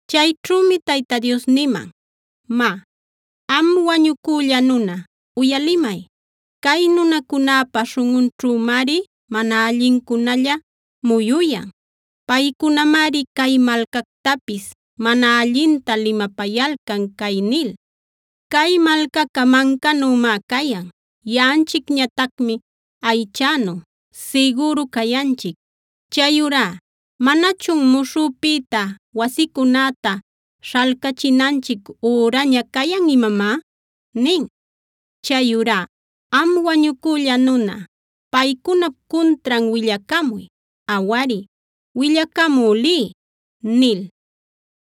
Chayćhümi Tayta Dios niman: “Má, am wañucülla nuna, uyalimay; cay nunacunäpa śhunꞌunćhümari mana allincunalla muyuyan. Paycunamari cay malcactapis mana allinta limapayalcan cay nil: ‘Cay malcaca mancänümá cayan; yaꞌanchicñatacmi aychänu sigüru cayanchic. Chayurá ¿manachun muśhüpïta wasicunäta śhalcachinanchic üraña cayan imamá?’ Chayurá am wañucülla nuna, paycunap cuntran willacamuy. Awari, willacamü liy” nil.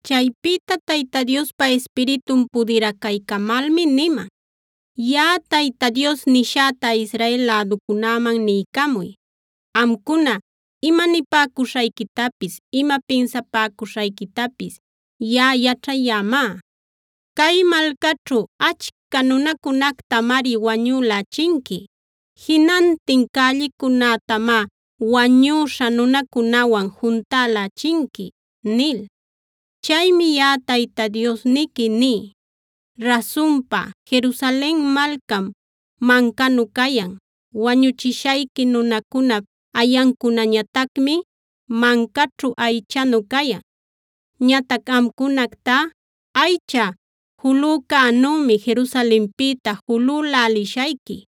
Chaypïta Tayta Diospa Ispiritun pudiracaycamalmi niman: “Yaꞌa Tayta Dios nishäta Israel läducunäman niycamuy: ‘Amcuna ima nipäcuśhayquitapis ima pinsapäcuśhayquitapis yaꞌa yaćhayämá. Cay malcaćhu achca nunacunactamari wañülächinqui. Jinantin cällicunätamá wañüśha nunacunawan juntälächinqui’ nil. Chaymi yaꞌa Tayta Diosniqui ní: Rasunpa, Jerusalen malcam mancanu cayan. Wañuchishayqui nunacunap ayancunañatacmi mancaćhu aychänu cayan. Ñatac amcunactá aycha julücänümi Jerusalenpïta julülälishayqui.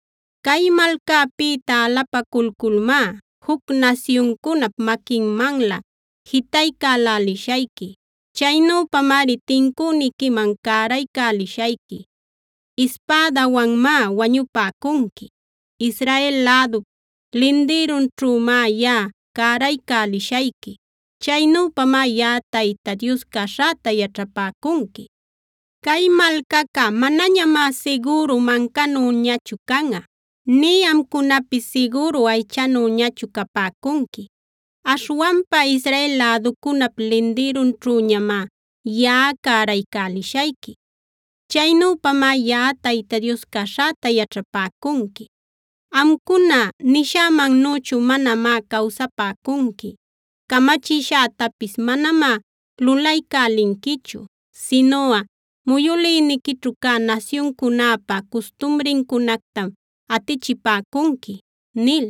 Cay malcäpïta alapaculculmá juc nasyuncunap maquinmanlä jitaycälälishayqui. Chaynüpamari tincüniquiman cäraycälishayqui. Ispädawanmá wañupäcunqui; Israel lädup lindïrunćhümá yaꞌa cäraycälishayqui. Chaynüpamá yaꞌa Tayta Dios caśhäta yaćhapäcunqui. Cay malcaca manañamá sigüru mancanüñachu canꞌa; nï amcunapis sigüru aychanüñachu capäcunqui. Aśhwanpa Israel läducunap lindïrunćhüñamá yaꞌa cäraycälishayqui. Chaynüpamá Yaꞌa Tayta Dios caśhäta yaćhapäcunqui. Amcuna nishämannüchu manamá cawsapäcunqui, camachishätapis manamá lulaycälinquichu, sinuꞌa muyülïniquićhu cä nasyuncunäpa custumrincunactam atichipäcunqui” nil.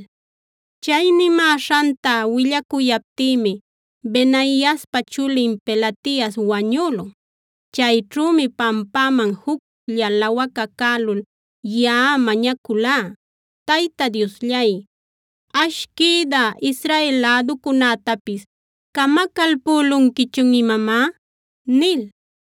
Chay nimäśhanta willacuyaptïmi Benaiaspa chulin Pelatias wañülun. Chayćhümi pampäman juclla lawacacälul yaꞌa mañaculá: “¡Tayta Diosllay! ¿Ash, quïdä Israel läducunätapis camacalpülunquichun imamá?” nil.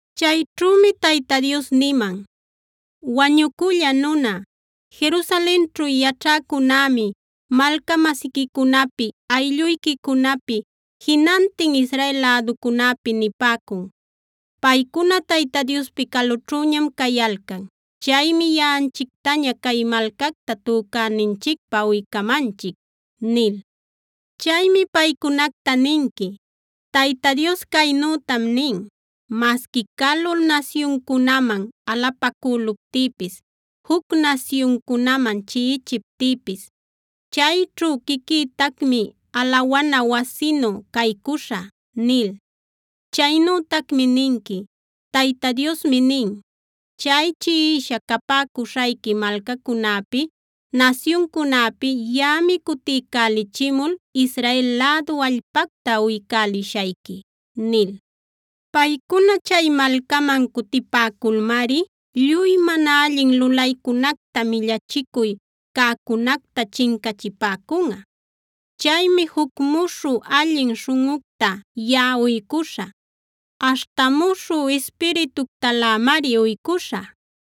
Chayćhümi Tayta Dios niman: “Wañucülla nuna, Jerusalenćhu yaćhäcunämi malca-masiquicunapi, aylluyquicunapi, jinantin Israel läducunäpi nipäcun: ‘Paycuna Tayta Diospi calućhüñam cayalcan. Chaymi yaꞌanchictaña cay malcacta tücäninchicpä uycamanchic’ nil. “Chaymi paycunacta ninqui: Tayta Dios caynütam nin: Masqui calu nasyuncunaman alapacüluptïpis, juc nasyuncunaman chiꞌichiptïpis, chayćhu quiquïtacmi alawana wasinu caycuśhä’ nil. Chaynütacmi ninqui: Tayta Diosmi nin: Chay chiꞌisha capäcuśhayqui malcacunäpi, nasyuncunäpi yaꞌami cutiycälichimul Israel lädu allpacta uycälishayqui’ nil. “Paycuna chay malcaman cutipäculmari lluy mana allin lulaycunacta, millachicuy cäcunacta chincachipäcunꞌa. Chaymi juc muśhü, allin śhunꞌucta yaꞌa uycuśhä; aśhta muśhü ispirituctalämari uycuśhä.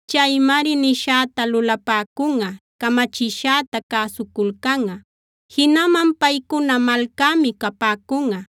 Chaymari nishäta lulapäcunꞌa; camachishäta cäsuculcanꞌa. Jinaman paycuna malcämi capäcunꞌa;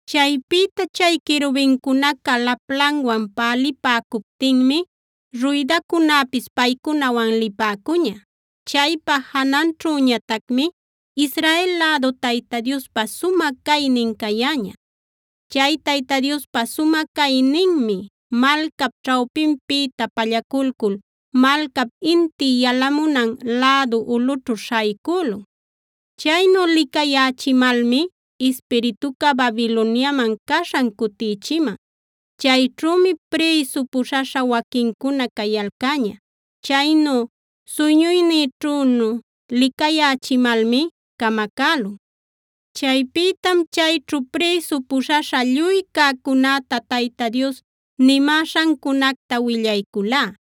Chaypïta chay querubincunaca laplanwan pälipäcuptinmi ruydacunäpis paycunawan lipäcuña. Chaypa jananćhüñatacmi Israel lädu Tayta Diospa sumä caynin cayäña. Chay Tayta Diospa sumä cayninmi malcap ćhawpinpïta pallaculcul malcap inti yalamunan lädu ulꞌućhu śhaycülun.d Chaynu licayächimalmi ispirituca Babiloniaman caśhan cutïchiman. Chayćhümi prïsu puśhaśha waquincuna cayalcäña. Chaynu suyñuynïćhünu licayächimalmi camacälun. Chaypïtam chayćhu prïsu puśhaśha lluy cäcunäta Tayta Dios nimäśhancunacta willayculá.